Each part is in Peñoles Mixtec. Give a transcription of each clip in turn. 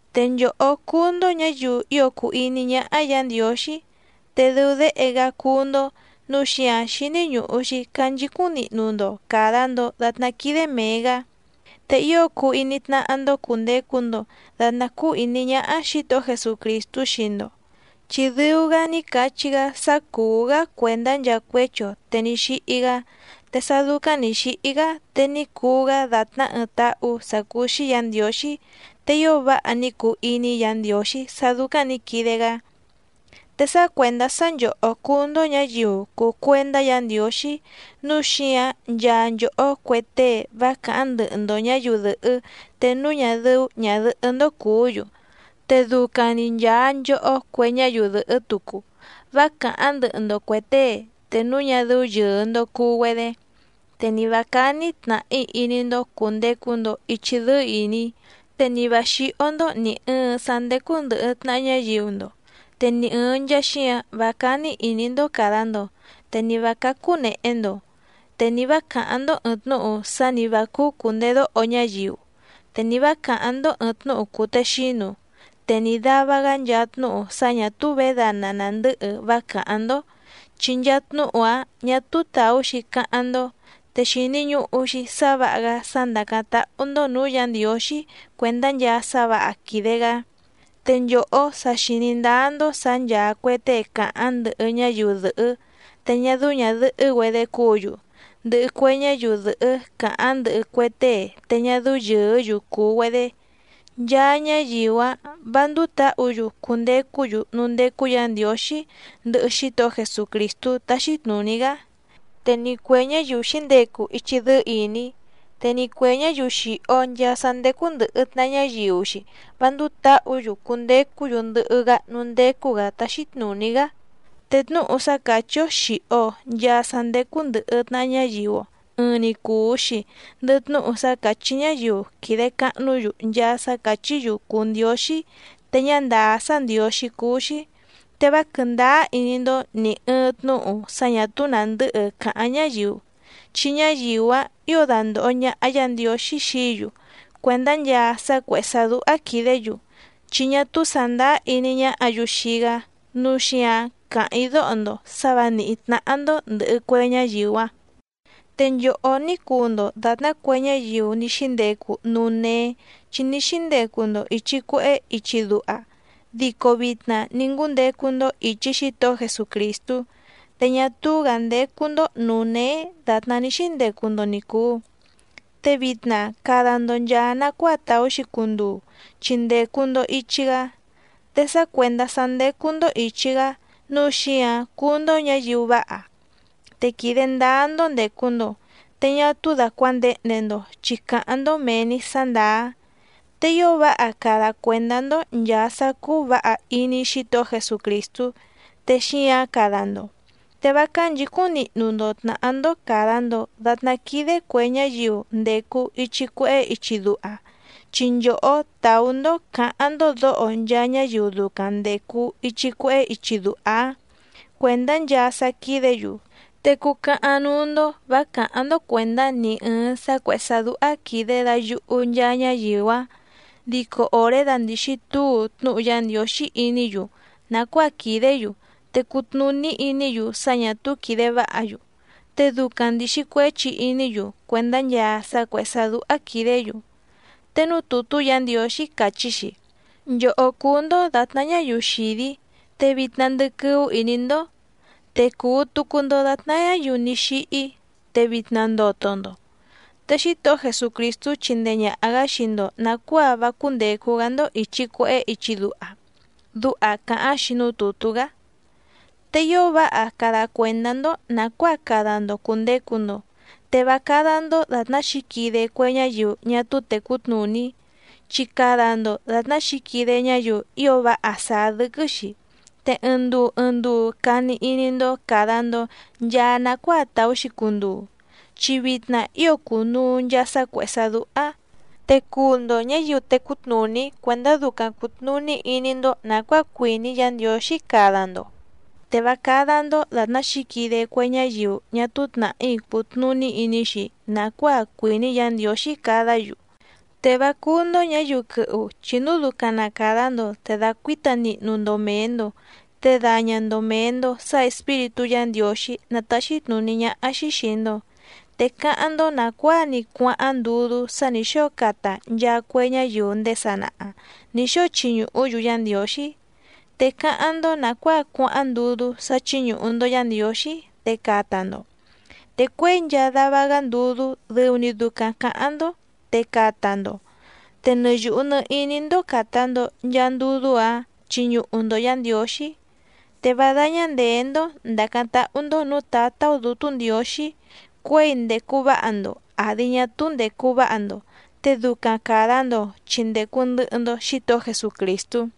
Te nchòhó cúú‑ndó ñǎyiu ío cùu iní ñáhá Yǎ Ndiǒxí, te dɨu déhe‑gá cúú‑ndó nǔu xíǎⁿ xíní ñùhu‑xi canchicúⁿ nihnu‑ndo càda‑ndo datná quídé mèe‑gá. Te ío cuu iní tnáhá‑ndó cùndecu‑ndo datná cúú ìní ñáhá Xǐtohó Jesucrìstú xii‑ndo, chi dɨu‑gá ní cachí‑gá sá cùú‑gá cuèndá nchaa cuéchi‑o te ní xíhí‑gá, te sá dúcáⁿ nǐ xíhí‑gá te ní cuu‑gá dàtná ɨɨⁿ táhú sǎ cúú‑xí Yǎ Ndiǒxí, te ío váha ní cuu iní Yǎ Ndiǒxí sá dúcáⁿ nǐ quide‑gá. Te sá cuèndá sá nchòhó cúú‑ndó ñǎyiu cùu cuendá Yǎ Ndiǒxí nǔu xíǎⁿ nchaa nchòhó cue tée vá càháⁿ ndɨhɨ‑ndo ñǎyiu dɨ̀hɨ́ te núu ñá dɨ́ú ñàdɨhɨ́‑ndó cùú‑yu, te ducaⁿ‑ni nchàa nchohó cue ñáyiu dɨ̀hɨ́ tucu vá càháⁿ ndɨhɨ‑ndo cuè tée te núu ñá dɨ́ú yɨ̀ɨ‑ndo cuu‑güedé, te ni vǎ cání tnàhí iní‑ndó cùndecu‑ndo ichi dɨ́ɨ́ ìní, te ni vǎ xíhó‑ndó nì ɨɨⁿ sá ndécú ndɨ̀hɨ tnaha ñáyiu‑ndo, te ni ɨ̀ɨⁿ nchaa xíǎⁿ vá cání ìní‑ndó càda‑ndo, te ni vǎ cácú nèhe‑ndo. Te ni vǎ càháⁿ‑ndó ɨ̀ɨⁿ tnúhu sá ni vǎ cúú cùndedóho ñáyiu, te ni vǎ càháⁿ‑ndó ɨ̀ɨⁿ tnúhu cùtexínu, te ni dàva‑gá nchaa tnúhu sá ñà túú vědana nàndɨ́hɨ vá càháⁿ‑ndó, chi nchaa tnúhu‑áⁿ ñà túú tàú‑xi cáháⁿ‑ndó, te xìni ñuhu‑xi sá vǎha‑gá sá ndàcáⁿ táhú‑ndó nǔú Yǎ Ndiǒxí cuèndá nchaa sá vǎha quìde‑gá. Te nchòhó sa xìní ndáá‑ndó sǎ ncháá cuè tée càháⁿ ndɨhɨ ñáyiu dɨ̀hɨ́ te ñá dɨ́ú ñàdɨhɨ́‑güedé cúǔ‑yu, ndɨhɨ cue ñáyiu dɨ̀hɨ́ càháⁿ ndɨhɨ cue tée te ñá dɨ́ú yɨ̀ɨ́‑yu cùu‑güedé, nchaa ñáyiu‑áⁿ vǎ ndúú tǎhǔ‑yu cundecú‑yu núú ndécú Yǎ Ndiǒxí ndɨhɨ Xítohó Jesucrìstú táxí tnùní‑gá. Te ni cuè ñáyiu xǐndecu ichi dɨ́ɨ́ ìní, te ni cuè ñáyiu xìho nchaa sá ndécú ndɨ̀hɨ tnaha ñáyiu‑xi vá ndúú tǎhǔ‑yu cundecú‑yu ndɨhɨ‑gá núú ndécú‑gǎ táxí tnùní‑gá. Te tnúhu sá càchí‑ó xìho‑o nchaa sá ndécú ndɨ̀hɨ tnaha ñáyiu‑o, ɨɨⁿ‑ni cùu‑xi ndɨhɨ tnúhu sá càchí ñáyiu quìde cahnú‑yu nchaa sá càchí‑yu cùu ndióxí te ñá ndàá sá ndiǒxí cúú‑xí. Te vá quɨ̀ndáá iní‑ndó nì ɨɨⁿ tnúhu sá ñà túú nàndɨ́hɨ càháⁿ ñáyiu, chi ñáyiu‑áⁿ ǐo dandòho ñaha Yá Ndiǒxí xií‑yu cuèndá nchaa sá cuèhé sá dúhá quìdé‑yu chi ñá túú sàndáá iní ñáhǎ‑yu xii‑gá. Núu xíǎⁿ càháⁿ‑í dóho‑ndo sǎ vǎ nìhí tnáhá‑ndó ndɨ̀hɨ cue ñáyiu‑áⁿ. Te nchòhó ní cuu‑ndo dàtná cue ñáyiu ní xíndecu núú néé chi ní xíndecu‑ndo ìchi cuehé ichi duha, dico vitna ní ngúndecu‑ndo ìchi Xítohó Jesucrìstú, te ñá túú‑gǎ ndécú‑ndó nǔú néé dàtná ní xíndecu‑ndo ni cùu. Te vitna cada‑ndo nchàa nacuáa tàú‑xi cunduu chi ndècu‑ndo ichi‑gá. Te sá cuèndá sá ndécú‑ndó ìchi‑gá nǔu xíǎⁿ cúú‑ndó ñǎyiu váha, te quìde ndáá‑ndó ndècu‑ndo, te ñá túú dàcuandehnde‑ndo chi càháⁿ‑ndó mèe‑ni sá ndàá. Te ío váha cada cuèndá‑ndó nchàa sá cúú vǎha iní Xítohó Jesucrìstú, te xíǎⁿ cada‑ndo. Te vá cánchǐcúⁿ nihnu‑ndo tnàhá‑ndó càda‑ndo datná quídé cuè ñáyiu ndècu ichi cuehé ichi duha, chi nchòhó tàú‑ndó cǎháⁿ‑ndó dǒho nchaa ñáyiu ducaⁿ ndècu ichi cuehé ichi duha‑áⁿ cuèndá nchaa sá quídě‑yu. Te cucahaⁿ núú‑ndó vǎ càháⁿ‑ndó cuèndá ni ɨ̀ɨⁿ sá cuèhé sá dúhá quìde dayuhu nchaa ñáyiu‑áⁿ. Dico òré dándìxi túu tnúhu Yá Ndiǒxí iní‑yu nàcuáa quìdé‑yu te cùtnuní iní‑yu sá ñǎ túú quìde váha‑yu, te ducaⁿ ndìxi cuéchi iní‑yu cuèndá nchaa sá cuèhé sá dúhá quìdé‑yu. Te núú tùtú Yǎ Ndiǒxí càchí‑xi: Nchòhó cúú‑ndó dàtná ñáyiu xìdí, te vitna ndɨquɨ́ú ìní‑ndó, te cùu tucu‑ndo datná ñáyiu ní xíhí, te vitna ndoto‑ndo, te Xítohó Jesucrìstú chindee ñàha‑gá xii‑ndo nàcuáa vá cúndècu‑gá‑ndó ìchi cuehé ichi duha. Duha càháⁿ‑xi núú tùtú‑gá. Te ío váha cada cuèndá‑ndó nàcuáa cada‑ndo cùndecu‑ndo, te vá cádá‑ndó dàtná xǐquide cue ñáyiu ñá túú tècú tnùní, chi cada‑ndo dàtná xǐquide ñáyiu ío váha sàá dɨ́quɨ́‑xi. Te ɨɨⁿ nduu ɨɨⁿ nduu cani iní‑ndó càda‑ndo nchaa nacuáa tàú‑xi cunduu, chi vitna ío cùnuu nchaa sá cuèhé sá dúhá. Te cuu‑ndo ñǎyiu tècú tnùní cuèndá ducaⁿ cùtnuní iní‑ndó nàcuáa cuìní Yǎ Ndiǒxí cada‑ndo, te vá cádá‑ndó dàtná xǐquide cue ñáyiu ñá túú tnàhí cùtnuní iní‑xi nàcuáa cuìní Yǎ Ndiǒxí cadá‑yu. Te vá cúú‑ndó ñǎyiu quɨhu chi núu ducaⁿ na càda‑ndo te dàcuíta nihnu‑ndo mèe‑ndo, te daña‑ndo mèe‑ndo sá Espíritú Yǎ Ndiǒxí ná tàxi tnuní ñáhá‑xí xìi‑ndo. Te cáháⁿ‑ndó nàcuáa‑ni cuáháⁿ ndudú sá nǐ xóo cata nchaa cue ñáyiu ndéé sanaha nǐ xóo chiñuhú‑yu Yá Ndiǒxí. Te cáháⁿ‑ndó nàcuáa cuáháⁿ ndudú sá chíñùhu‑ndo Yá Ndiǒxí, te cata‑ndo. Te cuěi nchaa dava‑gá ndudú dɨu‑ni ducaⁿ cǎháⁿ‑ndó te cata‑ndo. Te nɨ yùhu nɨ iní‑ndó càta‑ndo nchaa ndudú‑áⁿ chiñuhu‑ndo Yǎ Ndiǒxí. Te vá dáñá ndèé‑ndó ndàcáⁿ táhú‑ndó nǔú Tǎtá‑ó Dǔtú Ndiǒxí cuěi ndècu váha‑ndo àdi ñá túú ndècu váha‑ndo. Te ducaⁿ càda‑ndo chi ndècu ndɨhɨ‑ndo Xítohó Jesucrìstú.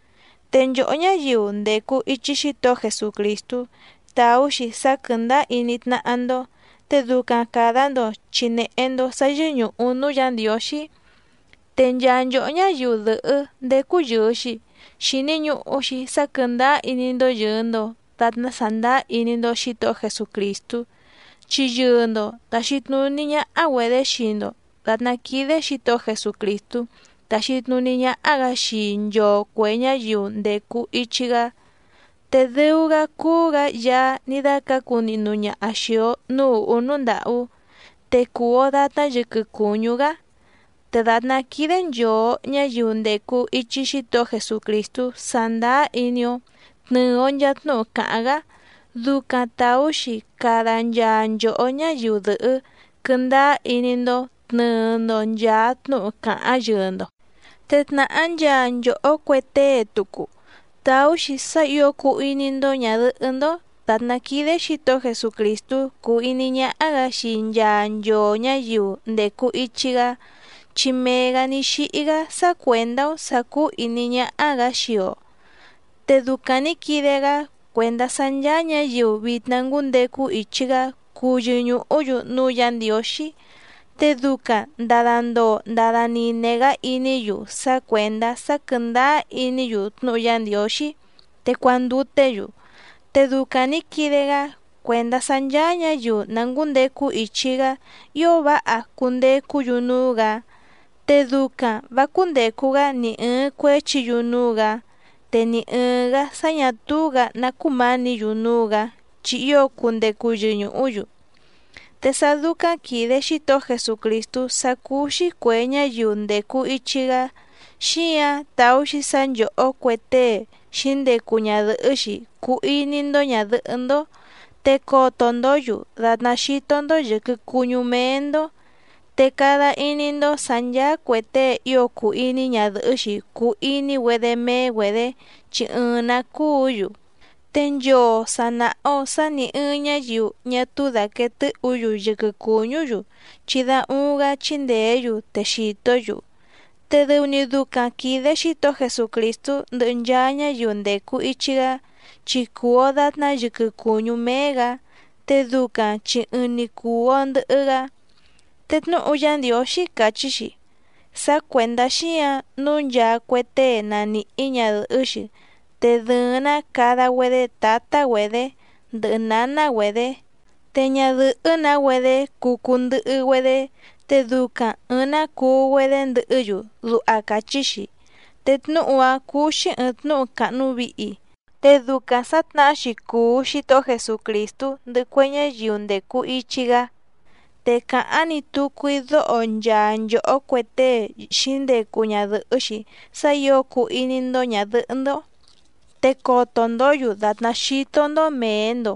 Te nchòhó ñáyiu ndècu ichi Xítohó Jesucrìstú tàú‑xi sá quɨ̀ndáá iní tnáhá‑ndó, te ducaⁿ càda‑ndo chi nèhe‑ndo sá yɨ́ñùhu núú Yǎ Ndiǒxí. Te nchaa nchòhó ñáyiu dɨ̀hɨ́ ndécú yɨ̀ɨ‑xi, xìni ñuhu‑xi sá quɨ̀ndáá iní‑ndó yɨ̀ɨ‑ndo datná sàndáá iní‑ndó Xǐtohó Jesucrìstú. Chi yɨɨ‑ndo tàxi tnuní ñáhá‑güedě xii‑ndo dàtná quídé Xǐtohó Jesucrìstú táxí tnùní ñáhá‑gǎ xii nchoo cuè ñáyiu ndècu ichi‑gá. Te dɨu‑gá cúú‑gǎ Yaá ní dácǎcu nihnu ñaha xìi‑o núú ùhú núú ndàhú, te cùu‑o datná yɨquɨ cùñú‑gá. Te dàtná quídé nchòo ñáyiu ndècu ichi Xítohó Jesucrìstú sàndáá iní‑ó tnɨ̀ɨ‑o nchaa tnúhu càháⁿ‑gá, ducaⁿ tàú‑xi cada nchaa nchòhó ñáyiu dɨ̀hɨ́ quɨ́ndáá iní‑ndó tnɨ̀ɨ‑ndo nchaa tnúhu càháⁿ yɨɨ‑ndo. Te tnàhá nchaa nchòhó cue tée tucu tàú‑xi sá ǐo cuu iní‑ndó ñàdɨhɨ́‑ndó dàtná quídé Xǐtohó Jesucrìstú cúú ìní ñáhá‑gǎ xii nchaa nchoo ñǎyiu ndècu ichi‑gá, chi mee‑gǎ ní xíhí‑gá sá cuèndá‑ó sǎ cúú ìní ñáhá‑gǎ xii‑o. Te ducaⁿ nǐ quide‑gá cuèndá sá ncháá ñǎyiu vitna ngúndecu ichi‑gá cuu yɨñùhú‑yu núú Yǎ Ndiǒxí, te ducaⁿ ndàda ndoo ndada nine‑gá iní‑yu sá cuèndá sá quɨ̀ndáá iní‑yu tnúhu Yá Ndiǒxí, te cuanduté‑yu. Te ducaⁿ nǐ quide‑gá cuèndá sá ncháá ñǎyiu na ngǔndecu ichi‑gá ío váha cundecú‑yu núú‑gǎ, te ducaⁿ vǎ cúndècu‑gá ni ɨ̀ɨⁿ cuéchi‑yu núú‑gǎ, te ni ɨ̀ɨⁿ‑gá sá ñà túú‑gǎ ná cumánǐ‑yu núú‑gǎ chi ío cundecu yɨñùhú‑yu. Te sá dúcáⁿ quìde Xítohó Jesucrìstú sá cúú‑xí cuè ñáyiu ndècu ichi‑gá, xíǎⁿ tàú‑xi sá nchòhó cue tée xǐndecu ñadɨ̀hɨ́‑xi cuu iní‑ndó ñàdɨhɨ́‑ndó, te coto‑ndǒ‑yu dàtná xító‑ndó yɨ̀quɨ cuñú méé‑ndó, te cada iní‑ndó sǎ ncháá cuè tée ío cùu iní ñadɨ̀hɨ́‑xi cùu iní‑güedé méé‑güedě chi ɨɨⁿ‑nǎ cúǔ‑yu. Te nchoo sà naha‑o sá nì ɨɨⁿ ñáyiu ñá túú dàquee tɨ́hǔ‑yu yɨquɨ cùñú‑yu, chi da uuⁿ‑gá chíndèé‑yu te xìtó‑yu. Te dɨu‑ni ducaⁿ quìde Xítohó Jesucrìstú ndɨhɨ nchaa ñáyiu ndècu ichi‑gá, chi cùu‑o datná yɨquɨ cùñú méé‑gǎ, te ducaⁿ chi ɨɨⁿ‑ni cùu‑o ndɨhɨ‑gá. Te tnúhu Yá Ndiǒxí càchí‑xi: “Sá cuèndá xíǎⁿ nǔu nchaa cue tée na nìhí ñadɨ̀hɨ́‑xi te dɨ̀ɨⁿ‑ná cada‑güedé tǎtá‑güedě ndɨhɨ nǎná‑güedě, te ñadɨ̀hɨ́‑nǎ‑güedé cuu cuu ndɨhɨ‑güedé, te ducaⁿ ɨ̀ɨⁿ‑ná cuu‑güedé ndɨhɨ́‑yu”, duha càchí‑xi. Te tnúhu‑a cùu‑xi ɨɨⁿ tnúhu càhnu vihi, te ducaⁿ sǎ tnàhá‑xi cùu Xítohó Jesucrìstú ndɨhɨ cue ñáyiu ndècu ichi‑gá. Te càháⁿ‑ni tucu‑í dóho nchaa nchòhó cue tée xǐndecu ñadɨ̀hɨ́‑xi sá ǐo cuu iní‑ndó ñàdɨhɨ́‑ndó te coto‑ndǒ‑yu dàtná xító‑ndó mèe‑ndo,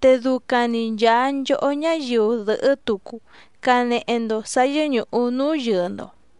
te ducaⁿ‑ni nchàa nchohó ñáyiu dɨ̀hɨ́ tucu canehe‑ndo sǎ yɨ́ñùhu núú yɨɨ‑ndo.